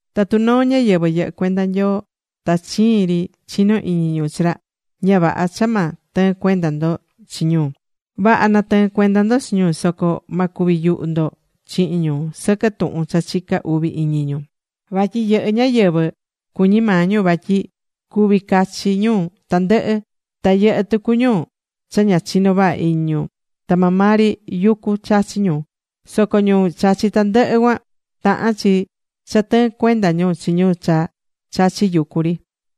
Tatu noo ñáyɨvɨ yɨhɨ́ cuenda Nyoo ta chiin ri chinó iñi ñu chi ra, ña vaha cha ma tɨɨn cuenda ndo chi ñu. Vaha na̱tɨɨn cuenda ndo chi ñu soco ma cuvi yuhu ndo chihin ñu sɨquɨ tuhun cha chicá uvi iñi ñu. Vatyi yɨhɨ́ ñáyɨvɨ cuñí maa ñu vatyi cuví cachi ñu tandɨhɨ. Ta yɨhɨ́ tucu ñu cha ña chinó vaha iñi ñu, ta maa maa ri yucu chachí ñu. Soco ñu chachí tandɨhɨ cuan, tahán chi cha tɨɨn cuenda ñu chi ñu cha chachí yucu ri.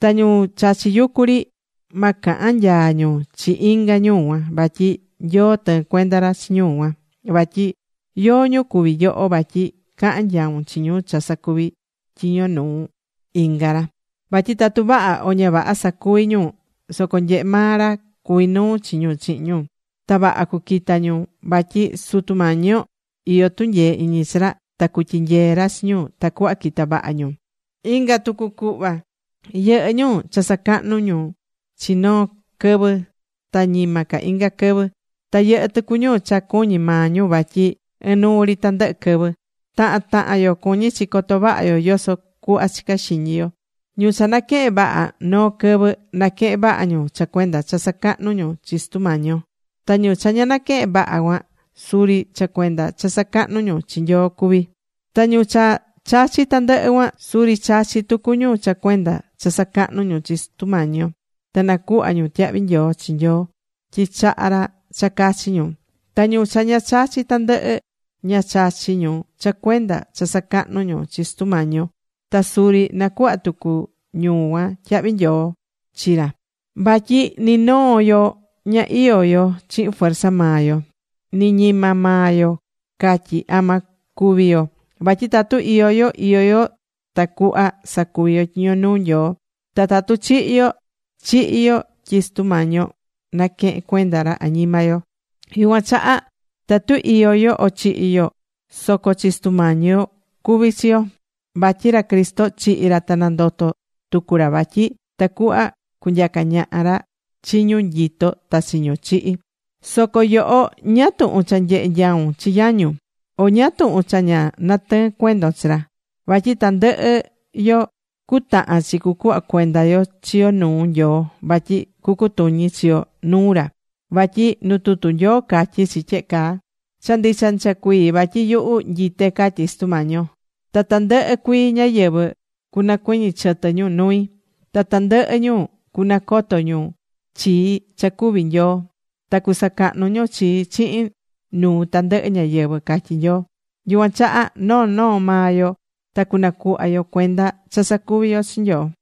Ta ñu chachí yucu ri, ma cahan nyaa ñu chi inga ñu cuan. Vatyi Nyoo tɨɨ́n cuenda ra chi ñu cuan. Vatyi ¿yóó ñu cuví yoho vatyi cahan nyaun chi ñu cha sacuví tyiño nuu inga ra? Vatyi tatu vaha o ña vaha sacuví ñu soco nyehe maa ra cuví nuu chi ñu chihin ñu. Ta vaha cuquita ñu vatyi Sutu Mañi yo iyó tunyee iñi chi ra ta cutyinyee ra chi ñu tacuhva quita vaha ñu. Inga tucu cuhva: Yɨhɨ́ ñu cha sacahnú ca ñu chi noo quɨvɨ ta ñima ca inga quɨvɨ. Ta yɨhɨ́ tucu ñu cha cuñí maa ñu vatyi ɨnuu ri tandɨhɨ quɨvɨ. Tahan tahan yo cuñí chi coto vaha yo yoso cuhva chicá xiñi yo. Ñu cha naquehén vaha noo quɨvɨ, naquehén vaha ñu cha cuenda cha sacahnú ñu chi Sutu Mañi yo. Ta ñu cha ña naquehén vaha cuan, suri cha cuenda cha sacahnú ñu chi Nyoo cuví. Ta ñu cha chachí tandɨhɨ cuan, suri chachí tucu ñu cha cuenda cha sacahnú ñu chi Sutu Mañi yo, ta nacuhva ñu tyahvi nyoo chi Nyoo tyi chaha̱ ra cha cachi ñu. Ta ñu cha ña chachí tandɨhɨ, ña chachí ñu cha cuenda cha sacahnú ñu chi Sutu Mañi yo ta suri nacuhva tucu ñu cuan tyahvi nyoo chi ra. Vatyi ni noo yo ña iyó yo chihin fuerza maa yo. Ni ñima maa yo catyí ama cúvi yo. Vatyi tatu iyó yo, iyó yo tacuhva sacuvi yo tyiño nuu Nyoo, ta tatu chihi̱ yo, chihi̱ yo tyi Sutu Mañi yo naquehe̱n cuenda ra añima yo. Yucuan chaha tatu iyó yo, o chihi̱ yo soco chi Sutu Mañi yo cuví chi yo. Vatyi ra Cristo chihi̱ ra ta nandoto̱ tucu ra vatyi tacuhva cunyaca ñaha ra chi ñu nyitó ta chi ñu chihi̱. Soco yoho, ¿ñáá tuhun cha nyehé nyaun chi yañun? ¿O ñáá tuhun cha ña natɨɨ́n cuendon chi ra? Vatyi tandɨhɨ yo cutahan chi cucuhva cuenda yo chi yo nuu Nyoo vatyi cutuñi chi yo nuu ra. Vatyi nu tutu Nyoo catyí chi tyehe caa: Cha ndicha ndicha cuii vatyi yuhu nyité, catyí Sutu Mañi yo. Ta tandɨhɨ cuii ñáyɨvɨ cunacuɨñɨ chɨtɨ ñu nui. Ta tandɨhɨ ñu cunacoto nuu ñu chii cha cuví Nyoo. Ta cusacahnu ñu chii chihin nuu tandɨhɨ ñáyɨvɨ, catyí Nyoo. Yucuan chaha noo noo maa yo ta cunacuhva yo cuenda cha sacuvi̱ yo chi Nyoo.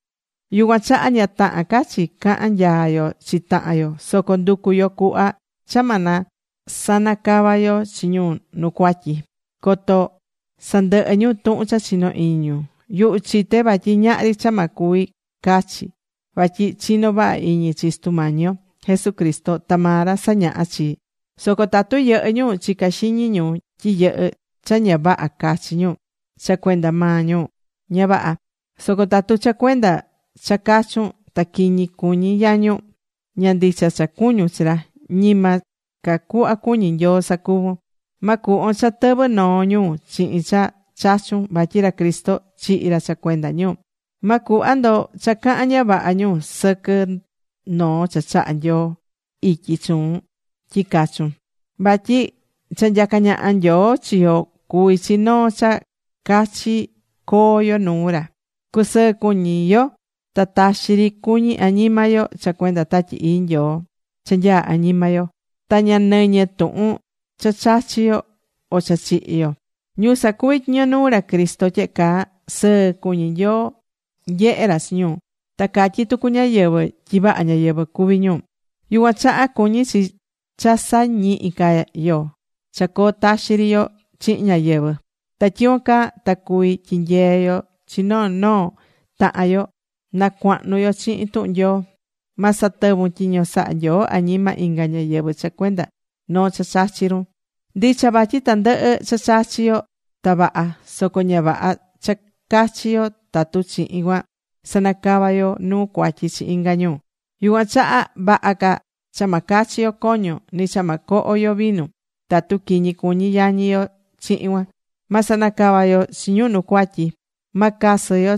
Yucuan chaha, ña tahán ca chi cahan nyaa yo chi tahan yo. Soco ndu̱cu yo cuhva cha ma sanacava yo chi ñu nu cuatyi coto sandɨhɨ ñu tuhun cha chino iñi ñu. Yuhu chité vatyi ñahri cha ma cuvi cachi, vatyi chinó vaha iñi chi Sutu Mañi yo Jesucristo, ta maa ra sañahá chii. Soco tatu yɨhɨ́ ñu chicá xiñi ñu tyi yɨhɨ́ cha ña vaha cachi ñu, cha cuenda maa ñu, ña vaha. Soco tatu cha cuenda cha chachún ta quiñi cuñí yañun, ña ndicha cha cuñún chi ra, ñima ca cuhva cuñí Nyoo sacuvún. Ma cuhvon cha tɨvɨ noo ñu chihin cha chachún vatyi ra Cristo chihi̱ ra cha cuenda ñu. Ma cuhva ndo cha cahan ña vaha ñu sɨquɨ noo cha chaha̱ Nyoo ityi chuun tyi cachun. Vatyi cha nyacá ñaha Nyoo chi yo cuví chi noo cha cachi coo yo nuu ra. Cusɨɨ́ cuñi yo ta taxi ri cuñi añima yo cha cuenda Tatyi Ii Nyoo cha nyaá añima yo. Ta ña nɨñɨ tuhun cha chachi yo o cha chihi yo. Ñu sacuví tyiño nuu ra Cristo tyehe caa, sɨɨ cuñí Nyoo nyehé ra chi ñu, ta catyí tucu ñáyɨvɨ tyi vaha ñáyɨvɨ cuví ñu. Yucuan chaha cuñí chi cha sa̱ñihi ca yo cha coo taxi ri yo chihin ñáyɨvɨ. Ta tyicuan caa ta cuví tyinyee yo chi noo noo tahan yo na cuahnu yo chihin tuhun Nyoo. Ma satɨvun tyiño sahá Nyoo añima inga ñáyɨvɨ cha cuenda noo cha chachí run. Ndicha vatyi tandɨhɨ cha chachí yo ta vaha. Soco ña vaha cha cachi yo tatu chihin cuan sanacavá yo nuu cuatyi chi inga ñu. Yucuan chaha, vaha ca cha ma cachi yo coño, ni cha ma coho yo vinu, tatu quiñi cuñi yañi yo chihin cuan. Ma sanacava yo chi ñu nu cuatyi. Ma casɨ yo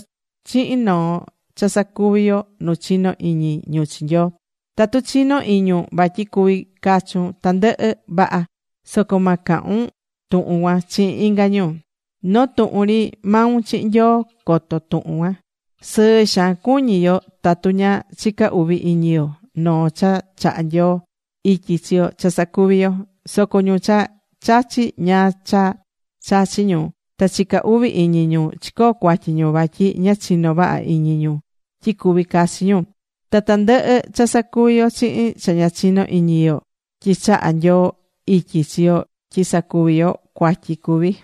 chihin noo cha sacuvi yo nu chinó iñi ñu chi Nyoo. Tatu chinó iñun vatyi cuví cachun tandɨhɨ, vaha. Soco ma cahun tuhun cuan chihin inga ñu. Noo tuhun ri maun chihin Nyoo coto tuhun cuan. Sɨɨ xaan cuñí yo tatu ña chicá uvi iñi yo noo cha chaha Nyoo ityi chi yo cha sacuví yo. Soco ñu cha chachí ñáá cha chachí ñu, ta chicá uvi iñi ñu, chicoo̱ cuatyi ñu, vatyi ña chinó vaha iñi ñu tyi cuví cachi ñu. Ta tandɨhɨ cha sacuví yo chihin cha ña chiño iñi yo tyi chaha Nyoo ityi chi yo tyi sacuvi yo, cuatyi cuví.